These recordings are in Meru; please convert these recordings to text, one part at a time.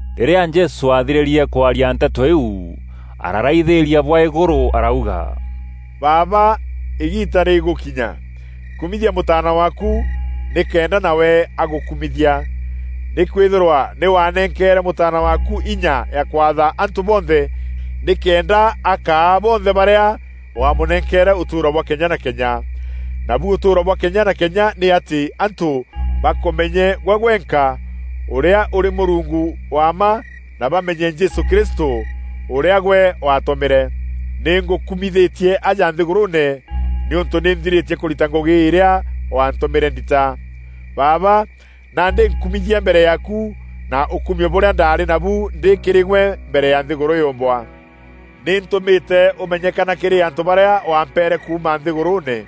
Rîrîa Jesû aathirîrie kwaria nteto îîu, aararaithîîria bwa îgûrû arauga, “Baaba, îgiita rîgûkinya. Kumithia Mûtaana waaku, nîkenda nawe agûkumithia. Nîkwîthîrwa nî waanenkeere Mûtaana waaku inya ya kwatha antû bonthe nîkenda akaa bonthe barîa waamûnenkeere ûtûûro bwa kenya na kenya. Nabu ûtûûro bwa kenya na kenya nî atî antû bakûmenye gwe gwenka ûrîa ûrî Mûrungu wa mma na bamenye Jesû Kristû ûrîa gwe waatûmîre. Nî ngûkumithîtie aja nthîgûrûûne nîûntû nî nthirîtie kûrita ngûgî irîa wantûmîre ndita. Baaba, nandî nkumithia mbere yaaku na ûkumio bûrîa ndaarî nabu ndî kîrî gwe mbere ya nthîgûrû yûûmbwa. “Nî ntûmîte ûmenyekana kîrî antû barîa wampeere kuuma nthîgûrûûne.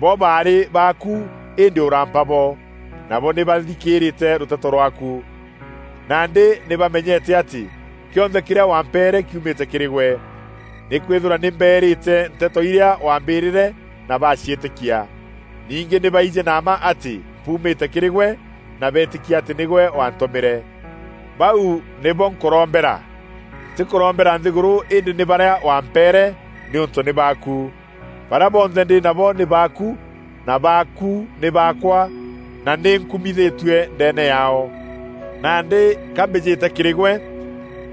Bo baarî baaku îndî ûrampa bo. Nabo nî bathîkîrîte rûteto rwaaku. Nandî nî bamenyete atî kîonthe kîrîa wampeere kiumîte kîrî gwe. Nîkwîthîrwa nî mbeerîte nteto irîa waambîrîre na baaciîtîkia. Ningî nî baijî na mma atî mpuumîte kîrî gwe na beetîkia atî nîgwe waantûmîre. Bau nîbo nkûrombera, ntîkûrombera nthîgûrû îndî nî barîa wampeere, nîûntû nî baaku. Barîa bonthe ndî nabo nî baaku, na baaku nî baakwa na nî nkumithîtue ndeene yaao. Nandî ka mbîjîte kîrî gwe,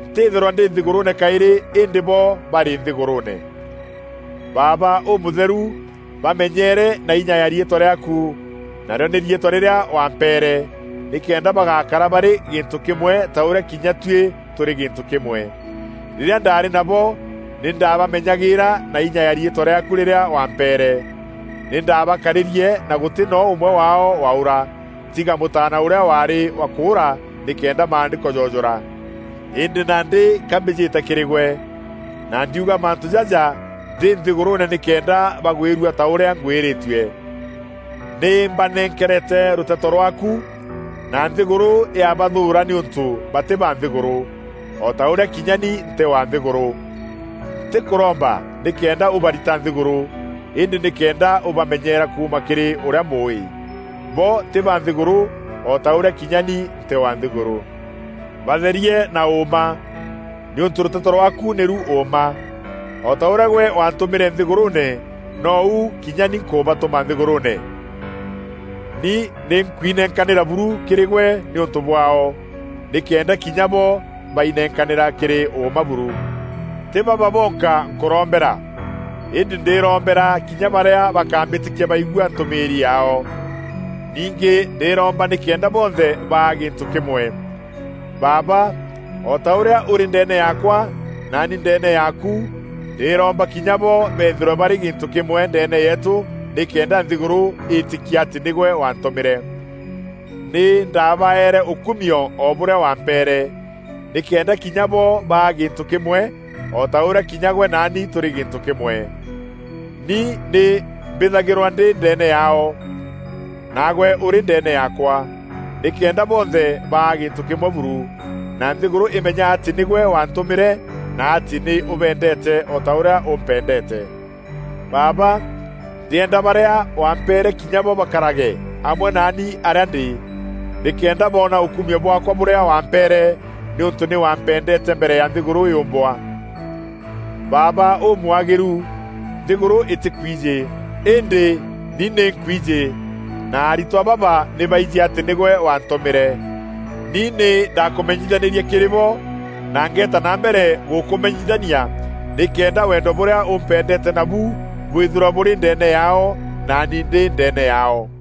ntîthîrwa ndî nthîgûrûûne kaîrî îndî bo barî nthîgûrûûne. Baaba Ûmûtheru, bamenyeere na inya ya riîtwa rîaaku, narîo nî riîtwa rîrîa wampeere, nîkenda bagakara barî gîntû kîmwe ta ûrîa kinya tuî tûrî gîntû kîmwe. Rîrîa ndaarî nabo, nî ndabamenyagîîra na inya ya riîtwa rîaaku rîrîa wampeere. Nî ndabakarîrie na gûtî noo ûmwe waao waûra, tiga mûtaana ûrîa waarî wa kûûra nîkenda Maandîko joojûra. Îndî nandî ka mbîjîte kîrî gwe, na ndiuga mantû jaja ndî nthîgûrûûne nîkenda bagwîrua ta ûrîa ngwîrîtue. Nî mbanenkerete rûteto rwaaku, na nthîgûrû yabathûûra nîûntû batî ba nthîgûrû, o ta ûrîa kinya ni ntî wa nthîgûrû. Ntîkûromba nîkenda ûbarita nthîgûrû, îndî nîkenda ûbamenyeera kuuma kîrî ûrîa mûûî. Bo tî ba nthîgûrû, o ta ûrîa kinya ni ntî wa nthîgûrû. Batherie na ûûma, nîûntû rûteto rwaaku nîru ûûma. O ta ûrîa gwe waantûmîre nthîgûrûûne, nou kinya ni nkûbatûma nthîgûrûûne. Ni nî nkwinenkanîra buru kîrî gwe nîûntû bwaao, nîkenda kinya bo bainenkanîra kîrî ûûma buru. “Tî baba bonka nkûrombera, îndî ndîrombera kinya barîa bakambîtîkia baigua ntûmîîri yaao. Ningî ndîromba nîkenda bonthe baa gîntû kîmwe. Baaba, o ta ûrîa ûrî ndeene yaakwa naani ndeene yaaku, ndîromba kinya bo beethîrwe barî gîntû kîmwe ndeene yeetû nîkenda nthîgûrû îîtîkia atî nîgwe waantûmîre. Nî ndaabaeere ûkumio o bûrîa wampeere, nîkenda kinya bo baa gîntû kîmwe o ta ûrîa kinya gwe naani tûrî gîntû kîmwe. Ni nî mbîthagîrwe ndî ndeene yaao, naagwe ûrî ndeene yaakwa nîkenda bonthe baa gîntû kîmwe buru, na nthîgûrû imenya atî nîgwe waantûmîre, na atî nî ûbeendeete o ta ûrîa ûmpendeete. “Baaba! Ndîenda barîa wampeere kinya bo bakarage amwe naani arîa ndî, nîkenda boona ûkumio bwaakwa bûrîa wampeere nîûntû nî wampendeete mbere ya nthîgûrû yûûmbwa. Baaba Ûmwagîru, nthîgûrû îtîkwijî, îndî ni nî nkwijî na aritwa baba nî baijî atî nîgwe waantûmîre. Ni nî ndaakûmenyithanîrie kîrî bo na ngeeta na mbere gûkûmenyithania nîkenda wendo bûrîa ûmpendeete nabu bwîthîrwa bûrî ndeene yaao, naani ndî ndeene yaao.”